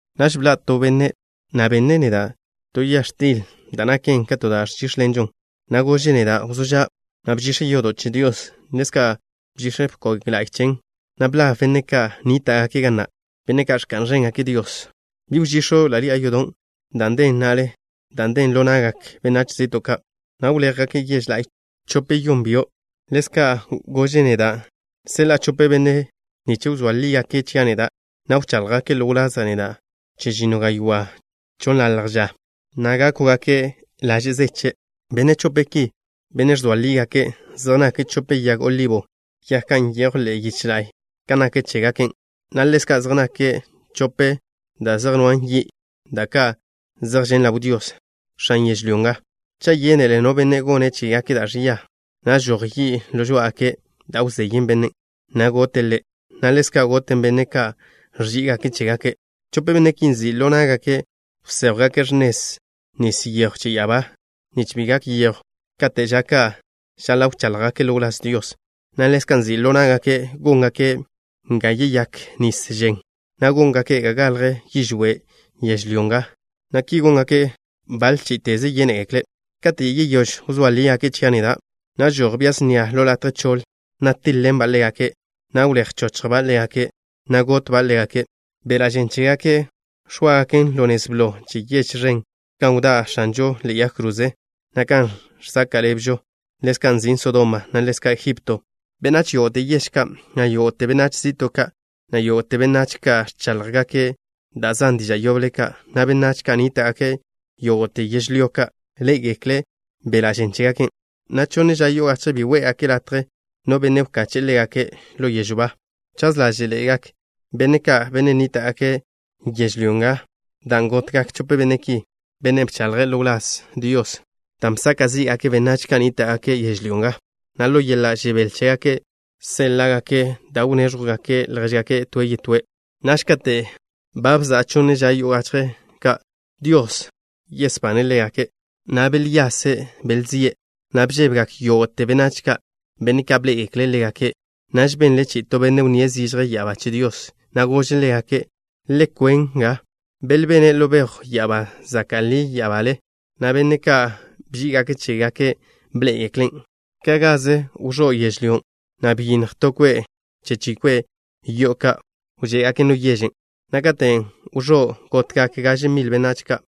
Naž bḻa' to benne', na' benne' neda' to ya x̱til da' naken ka to da' ẕžíx̱ḻenžo, na' gože' neda': “Wzó ža', na' bžix̱ yodo' che Dios. Ḻezka' bžix̱ bkog la'y chen, na' blab benne' ka' nníta'gake' ga na', benne' ka' ẕka'n ẕéngake' Dios. Bi wžix̱o' ḻi'a yodon' dan' den na'le, dan' nden ḻo na'gak benách zi'to' ka', na' wléjgake' yež la'y chope-yeyón byo'.” Ḻezka' gože' neda': “Seḻa'a chope benne' nich wzóa lígake' chia' neda', na' wcháḻjgake' ḻo wlaza' neda' chežinno gaywá' chonnḻalj ža, na' gákwgake' laže' zeche'.” Benne' chope ki, benne' ẕzoa lígake', zej nake' chope yag olibo, yag ka' nyejw ḻe'e yiche la'y kan nak chégaken, na' ḻezka' zej nake' chope da' zej nwa' yi', da' ka' zej žen' ḻaw Dios, X̱an yežlyó nga. Cha' yénele no benne' gone' chégake' da' ẕia, na' žoj yi' ḻo žoá'agake' da' wzeyen bennen', na' goten ḻe', na' ḻezka' goten benne' ka' ẕží'igake' chégake'. Chope benne' ki nzi' ḻo ná'gake' wséjwgake' x̱nez nis yejw che ya'abá, nich bi gak yejw kate' ža ka' žaḻa' wcháḻjgake' ḻo wláz Dios, na' ḻezka' nzi' ḻo ná'gake' góngake' ga yeyák nis žen, na' góngake' ga galj yižwé' yežlyó nga, na' ki góngake' baḻe chí'iteze yénegekle'. Kate' yeyóž wzóa lígake' chia' neda', na' žoj bia snia ḻo latje choḻ, na' tíḻ-ḻenba' ḻégake', na' wléj wchochjba' ḻégake', na' gotba' ḻégake'. Beḻa' žen chégake' x̱óagaken ḻo nez blo che yež ẕen, gan wdá' X̱anžon' ḻe'e yag kroze, na' kan žsaka' ḻebžo, ḻezka' nzin' Sodoma, na' ḻezka' Egipto. Benách yógo'te yež ka', na' yógo'te benách zi'to' ka', na' yógo'te benách ka' ẕcháḻjgake' da' zan diža' yoble ka', na' benách ka' nníta'gake' yógo'te yežlyó ka', ḻé'egekle' beḻa' žen chégake', na' chonne ža yo'o gachje bi gónngake' latje no benne' wkache'e ḻégake' ḻo yežw ba. Chaz ḻáže'ḻe'egak benne' ka', benne' nníta'gake' yežlyó nga dan' gotgak chope benne' ki, benne' bcháḻjgake' ḻo wláz Dios, dan' bsaka' zí'gake' benách ka' nníta'gake' yežlyó nga, na' ḻo yeḻa' žebél chégake' séḻa'gake' da' wnéẕjwzegake' ljéžgake' toe' yetóe'. Naž kate' ba bza'a chonne ža yo'o gachje ka', Dios besbane' ḻégake', na' belyase' belzíe', na' bžébegak yógo'te benách ka', benne' ka' bḻé'egekle' ḻégake'. Naž benle chi'i to benne' wnníe' zižje ya'abá che Dios, na' gože' ḻégake': “Le kwen nga.” Belbene' ḻo bejw ya'abá zaka' ḻi ya'abale, na' benne' ka' bží'igake' chégake' bḻé'egeklen'. Ka' gaze wẕó' yežlyó, na' byinnj to kwe' che chi kwe' yo'o ka' wžé'gaken ḻo yežen', na' katen' wẕó', gotgak gaže mil benách ka'.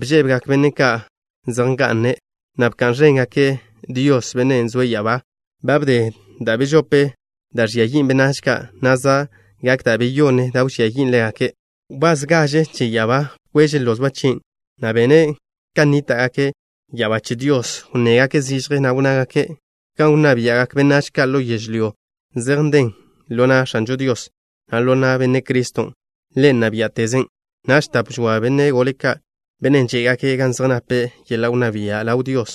Bžébegak benne' ka' zej nga'ne', na' bka'n ẕéngake' Dios, Bennen' zoe' ya'abá. Ba wdé da' bežope da' ẕžia yin' benách ka', na' za' gak da' beyonne da' wžía yin' ḻégake'. Wbás gaže che ya'abá bkweže' lozba' chien', na' benne' ka' nníta'gake' ya'abá che Dios wnnégake' zižje, na' wnnágake': ¡Gan wnná bia'gak benách ka' ḻo yežlyó zej nden ḻo na' X̱anžo Dios, na' ḻo na' Benne' Criston'! ¡Ḻe' nna biá'teze'! Naž tap žoa benne' gole ka', benne' žé'gake' gan zej nape' yeḻa' wnná bia' ḻaw Dios,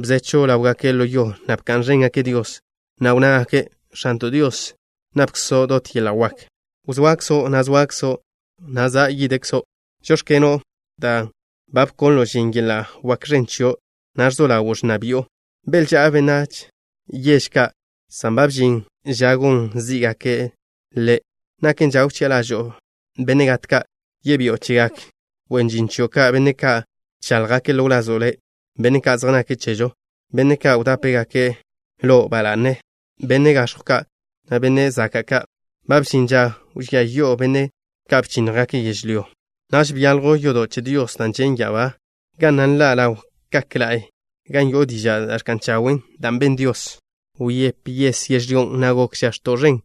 bzechw ḻáwgake' ḻo yo, na' bka'n ẕéngake' Dios. Na' wnnágake': ¡X̱anto' Dios, napkzo' dot yeḻa' wak! Wzoakzo', na' zoakzo', na' za' yidkzo'. Žóx̱keno', dan' ba bkonlo' žin yeḻa' wak ẕen chio', na' ẕzo ḻawo' ẕnna bi'o. Belžá'a benách yež ka' san ba bžin ža gon zí'gako'-ne'. Naken ža wchi'a ḻažo'o benne' gat ka'. Yebi'o chegak wen žin chio' ka', benne' ka' bcháḻjgake' ḻo wlazo' Le', benne' ka' zej nake' chezo', benne' ka' wdápegake' Lo' ba la'ne, benne' gax̱jw ka', na' benne' zaka' ka'. Ba bžin ža wžía yi'o benne' ka' bchínnjgake' yežlyó. Naž byaljw yodo' che Dios da' žen' ya'abá, ga na' nḻa' ḻaw kak la'y gan yo'o diža' da' ẕka'n chawen', dan' ben Dios. Wyép yes yežlyó, na' benle žax̱to' ẕen,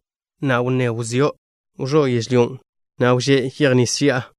na' wnné wzió'. Wẕó' yežlyón', na' wžé' yej nis ži'a.